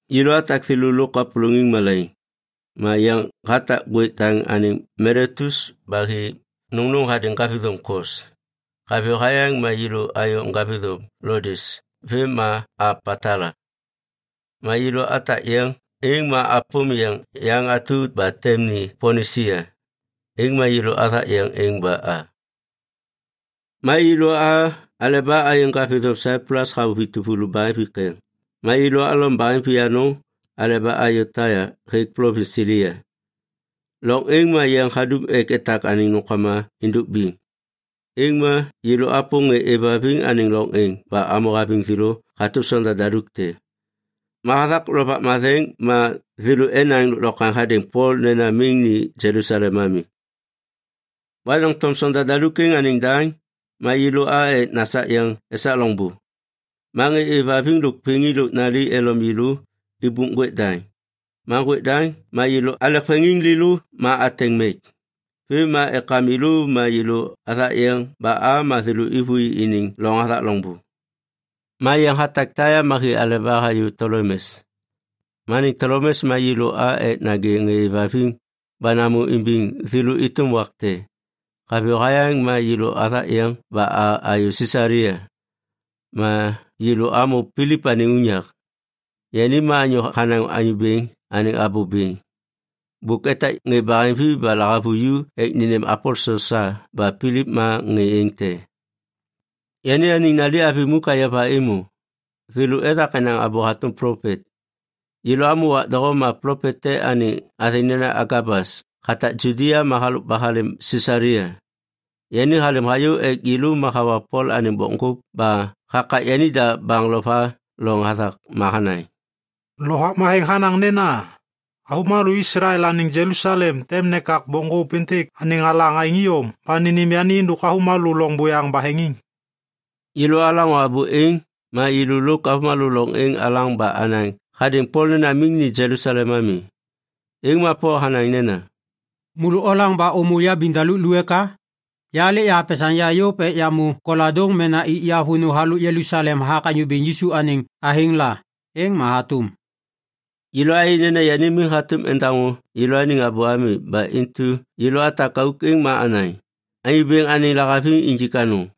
Yêlô atak thêlô lôk kapôlôŋiŋ malaiŋ, ma yeŋ hatak ŋgwêk daŋ anêŋ Miletus ba hi nôŋnôŋ hadêŋ ŋgavithôm Kos. Haviyô hayaŋ ma yêlô ayô ŋgavithôm Lodes vêm ma a Patala. Ma yêlô atak yeŋ êŋ ma apôm yeŋ yaŋ atu ba tem ni Pinisia, êŋ ma yêlô athak yeŋ êŋ ba a. Ma yêlô a aleba ayê ŋgavithôm Saiplus hamô vituvulu baheŋvi keŋ ma yêlô alom baheŋvi anôŋ aleba ayô Taia hêk plovins Silia. Loŋ êŋ ma yeŋ hadum ek etak anêŋ nômkama êndôk biŋ. Êŋ ma yêlô apôm ŋê êvhaviŋ anêŋ loŋ êŋ ba amô haviŋ thêlô hatôm sonda daluk te. Ma hathak Lovak Matheŋ ma thêlô enaŋ lôklokwaŋ hadêŋ Pol nena miŋ ni Jelusalem ami. Ma doŋtom sonda daluk êŋ anêŋ daŋ, ma yêlô a ek nasak yeŋ esak loŋbô. Ma ŋê êvhaviŋ lôk vêŋi lôk nali elom yêlô ibup ŋgwêk daŋ. Ma ŋgwêk daŋ ma yêlô alek veŋiŋ lêlô ma ateŋ mek. Vêm ma ekam yêlô ma yêlô athak yeŋ ba a ma thêlô êvôi iniŋ loŋ hathak loŋbô. Ma yeŋ hatak Taia ma hi aleba hayô Tolemes. Ma anêŋ Tolemes ma yêlô a ek nagê ŋê êvhaviŋ ba namô imbiŋ thêlô êtôm wak te. Haviyô hayaŋ ma yêlô athak yeŋ ba a ayô Sisalia. Ma yêlô amô Pilip anêŋ unyak. Yani ma anyô hanaŋ Anyô Bêŋ anêŋ abô bêŋ. Bôk etak ŋê baheŋvi ba lahavuju ek nênêm aposel sa ba Pilip ma ŋê êŋ te. Yani anêŋ nali avi muk ayova êmô. Thêlô ethak enaŋ abô hatôm plopet. Yêlô amô wak doho ma plopet te anêŋ athêŋ nena Agabas hatak Judia ma halôk ba halêm Sisalia. Yani halêm hayô ek yêlô ma hawa Pol anêŋ bokŋgôp ba hakak yanida baŋ lo va loŋ hathak ma hanaŋ, “Lovak Matheŋ hanaŋ nena, ‘Avômalô Islael anêŋ Jelusalem tem nekak bokŋgôp êntêk anêŋ alaŋ aêŋ iyom ba nênêm yani êndôk avômalô loŋ buyaŋ baheŋiŋ.’” Yêlô alaŋô abô êŋ, ma yêlô lôk avômalô loŋ êŋ alaŋ ba anaŋ hadêŋ Pol nena miŋ ni Jelusalem ami. Êŋ ma Pol hanaŋ nena, “Môlô olaŋ ba ômô yabiŋdaluk lu eka? Ya lêk yahapesaŋ ya yôv ek yamô koladôŋ mena ik ya vônô halôk Jelusalem hathak Anyô Bêŋ Yisu anêŋ athêŋ la. Êŋ ma hatôm.” Yêlô ayê nena yani miŋ hatôm endaŋô yêlôaniŋ abô ami ba intu yêlô atak auk êŋ ma anaŋ, “Anyô Bêŋ anêŋ lahaviŋ injik anôŋ.”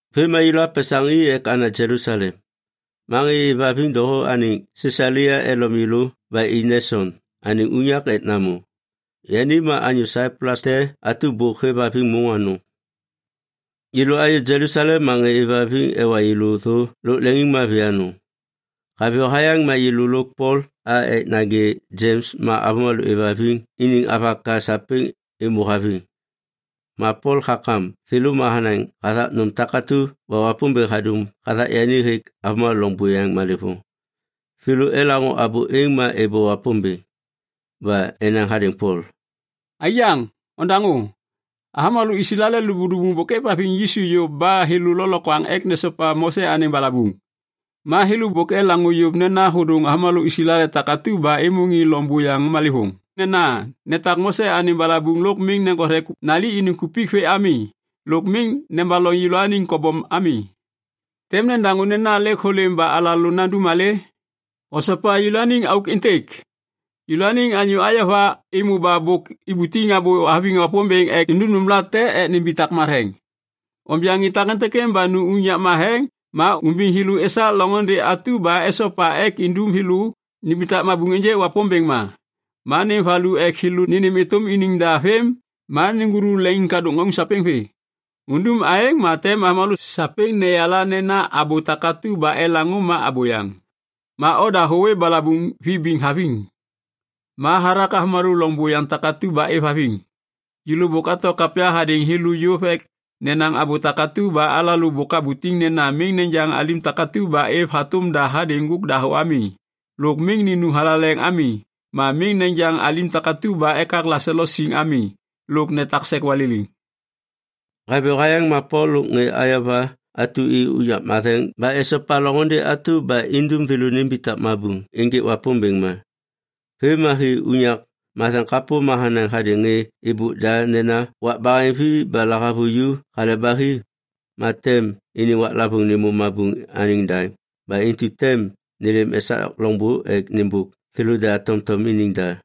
Vêm ma yêlô apesaŋ i ek ana Jelusalem. Ma ŋê êvhaviŋ doho anêŋ Sisalia elom yêlô ba i Neson anêŋ unyak ek namô. Yani ma anyô Saiplus te atu ba bôk hêvhaviŋ môŋ anôŋ. Yêlô ayô Jelusalem ma ŋê êvhaviŋ ewa yêlô thô lôk leŋiŋmavi anôŋ. Haviyô hayaŋ ma yêlô lôk Pol a ek nagê Jems ma avômalô êvhaviŋ iniŋ avaka sapêŋ êmô haviŋ. Ma Pol hakam thêlô ma hanaŋ hathak nôm takatu ba Wapômbêŋ hadum hathak yani hêk avômalô loŋ buyaŋ malêvôŋ. Thêlô elaŋô abô êŋ, ma êbô Wapômbêŋ. Ba enaŋ hadêŋ Pol, “Aiyaŋ, ondaŋô. Avômalô Islael lubuŋlubuŋ bôk êvhaviŋ Yisu yôv ba thêlô lôklokwaŋ ek nesopa Mose anêŋ balabuŋ. Ma thêlô bôk elaŋô yôv nena hôdôŋ avômalô Islael takatu ba êmô ŋê loŋ buyaŋ malêvôŋ nena netak Mose anêŋ balabuŋ lôk miŋ neŋgothe nali iniŋ kupik vê ami lôk miŋ nebaloŋ yêlôaniŋ kobom ami. Tem nedaŋô nena lêk hôlêm ba alalô nandum malê? Osopa yêlôaniŋ auk êntêk. Yêlôaniŋ anyô ayova êmô ba bôk ibutiŋ abô haviŋ Wapômbêŋ ek nindum nômlate ek nimbitak matheŋ. Onja ŋê takêntêk ba nu unyak matheŋ ma umbiŋ thêlô esak loŋôndê atu ba esopa ek indum thêlô nimbitak mabuŋ ênjêk Wapômbêŋ ma. Ma nêm valu ek thêlô nênêm êtôm iniŋ da vêm ma neŋgulu leŋiŋkadôk ŋauŋ sapêŋ vê. Undum aêŋ ma tem avômalô sapêŋ neyala nena abô takatu ba elaŋô ma abôyaŋ. Ma oda hôwê balabuŋ vibiŋ haviŋ. Ma hathak avômalô loŋ buyaŋ takatu ba êvhaviŋ, yêlô bôk ato kapya hadêŋ thêlô yôv ek nenaŋ abô takatu ba alalô bôk abutiŋ nena thêlô miŋ nejaŋ alim takatu ba êv hatôm da hadêŋ ŋgôk dahô ami, lôk miŋ ninum thalaleŋ ami, ma miŋ nejaŋ alim takatu ba ekak leŋselo siŋ ami, ma netak sek waliliŋ.” Haviyô hayaŋ ma Pol lôk ŋê ayova atu i unyak matheŋ ba esopa loŋôndê atu ba indum thêlô nimbitak mabuŋ ênjêk Wapômbêŋ ma. Vêm ma hi unyak matheŋ kapô ma hanaŋ hadêŋ ŋê êbôk da nena wak baheŋvi ba lahavuju hale ba hi, ma tem iniŋ waklavôŋ nêmô mabuŋ anêŋ daŋ ba intu tem nêlêm esak loŋbô ek nêmbôk thêlôda tomtom iniŋ da.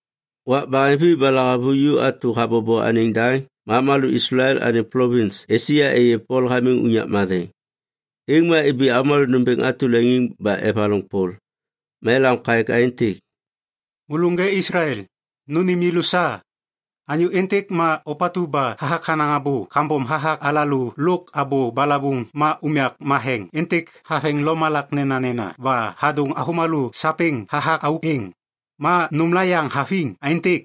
Wak baheŋvi ba lahavuju atu habobo anêŋ daŋ ma avômalô Islael anêŋ plovins Esia êyê Pol hamiŋ unyak matheŋ. Êŋ ma ibi avômalô nômbêŋ atu leŋiŋ ba evaloŋ Pol. Ma elam kaêk aêntêk, “Môlô ŋê Islael, nônêm yêlô sa! Anyô êntêk ma ôpatu ba hathak hanaŋ abô kambom hathak alalô lôk abô balabuŋ ma unyak matheŋ êntêk haveŋ lomalak nenanena ba hadôŋ avômalô sapêŋ hathak auk êŋ. Ma nômla yaŋ haviŋ aêntêk.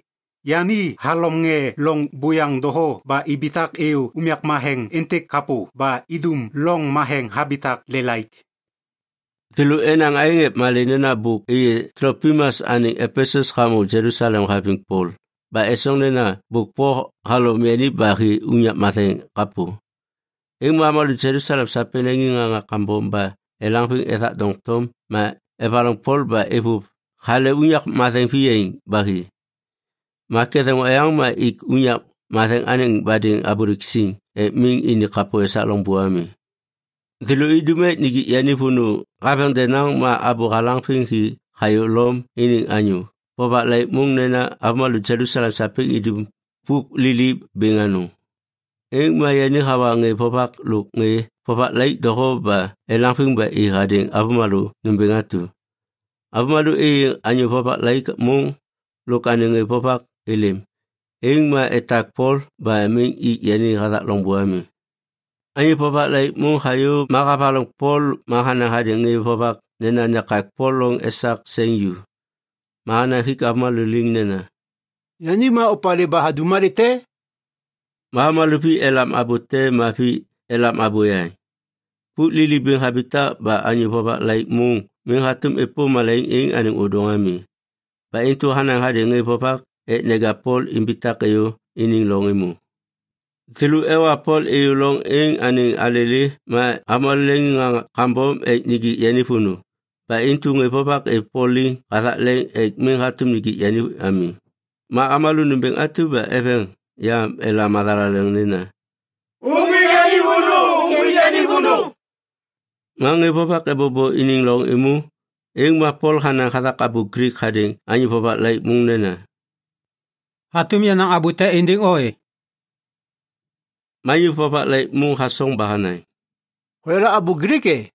Yani halom ŋê loŋ buyaŋ doho ba ibitak êyô unyak matheŋ êntêk kapô ba idum loŋ matheŋ habitak lelaik.” Thêlô enaŋ aêŋ ek malê nena bôk êyê Tlopimas anêŋ Epesus hamô Jelusalem haviŋ Pol ba esoŋ nena bôk Pol halom yani ba hi unyak matheŋ kapô. Êŋ ma avômalô Jelusalem sapêŋ leŋiŋŋaŋa kambom ba elaŋviŋ ethak doŋtom ma evaloŋ Pol ba êvôv hale unyak matheŋ viyaiŋ ba hi. Ma ketheŋ oyaŋ ma ik unyak matheŋ anêŋ badêŋ abôlêk siŋ ek miŋ ini kapô esak loŋbô ami. Thêlô idum ek nijik yani vônô haveŋ denaŋ, ma abô halaŋviŋ hi hayô Lom iniŋ anyô vovak laik môŋ nena avômalô Jelusalem sapêŋ idum pôk lili bêŋ anôŋ. Êŋ ma yani hawa ŋê vovak lôk ŋê vovak laik doho ba elaŋviŋ ba i hadêŋ avômalô nômbêŋ atu. Avômalô êyê anyô vovak laik môŋ lôk anêŋ ŋê vovak êlêm, êŋ ma etak Pol ba miŋ ik yani hathak loŋbô ami. Anyô vovak laik môŋ hayô ma havaloŋ Pol ma hanaŋ hadêŋ ŋê vovak nena nekak Pol loŋ esak seŋ ju. Ma hanaŋ hik avômalô liŋ nena, “Yani ma opalê ba hadum malê te?” Ma avômalô vi elam abô te ma vi elam abô yaŋ. Pôk lili bêŋ habitak ba anyô vovak laik môŋ miŋ hatôm êpôm malaiŋ êŋ anêŋ ôdôŋ ami. Ba intu hanaŋ hadêŋ ŋê vovak ek neja Pol imbitak êyô iniŋ loŋ êmô. Thêlô ewa Pol êyô loŋ êŋ anêŋ alêlê ma avômalô leŋiŋŋaŋa kambom ek nijik yani vônô ba intu ŋê vovak êv Pol liŋ hathak leŋ ek miŋ hatôm nijik yani ami. Ma avômalô nômbêŋ atu ba eveŋ yam elam mathalaleŋ nena, “Uŋgwik yani vônô! Uŋgwik yani vônô!” Ma ŋê vovak ebobo iniŋ loŋ êmô, êŋ ma Pol hanaŋ hathak abô Glik hadêŋ anyô vovak laik môŋ nena, “Hatôm yanaŋ abô te êndêŋ o e?” Ma anyô vovak laik môŋ hasoŋ ba hanaŋ, “Hoyala abô Glik, e?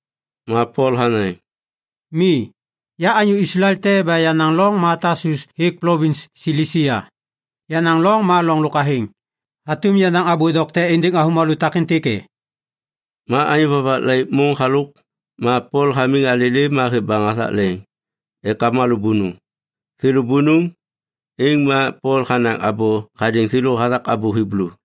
Ma Pol hanaŋ, “Mi. Ya anyô Islael te ba yenaŋ loŋ ma Tasus hêk plovins Silisia. Yenaŋ loŋ ma loŋ lôk athêŋ. Hatôm yanaŋ abô dokte êndêŋ avômalô takêntêk e?” Ma anyô vovak laik môŋ halôk, ma Pol hamiŋ alêlê ma hêv baŋ hathak leŋ ek avômalô bônôŋ. Thêlô bônôŋ, êŋ ma Pol hanaŋ abô hadêŋ thêlô hathak abô Hiblu.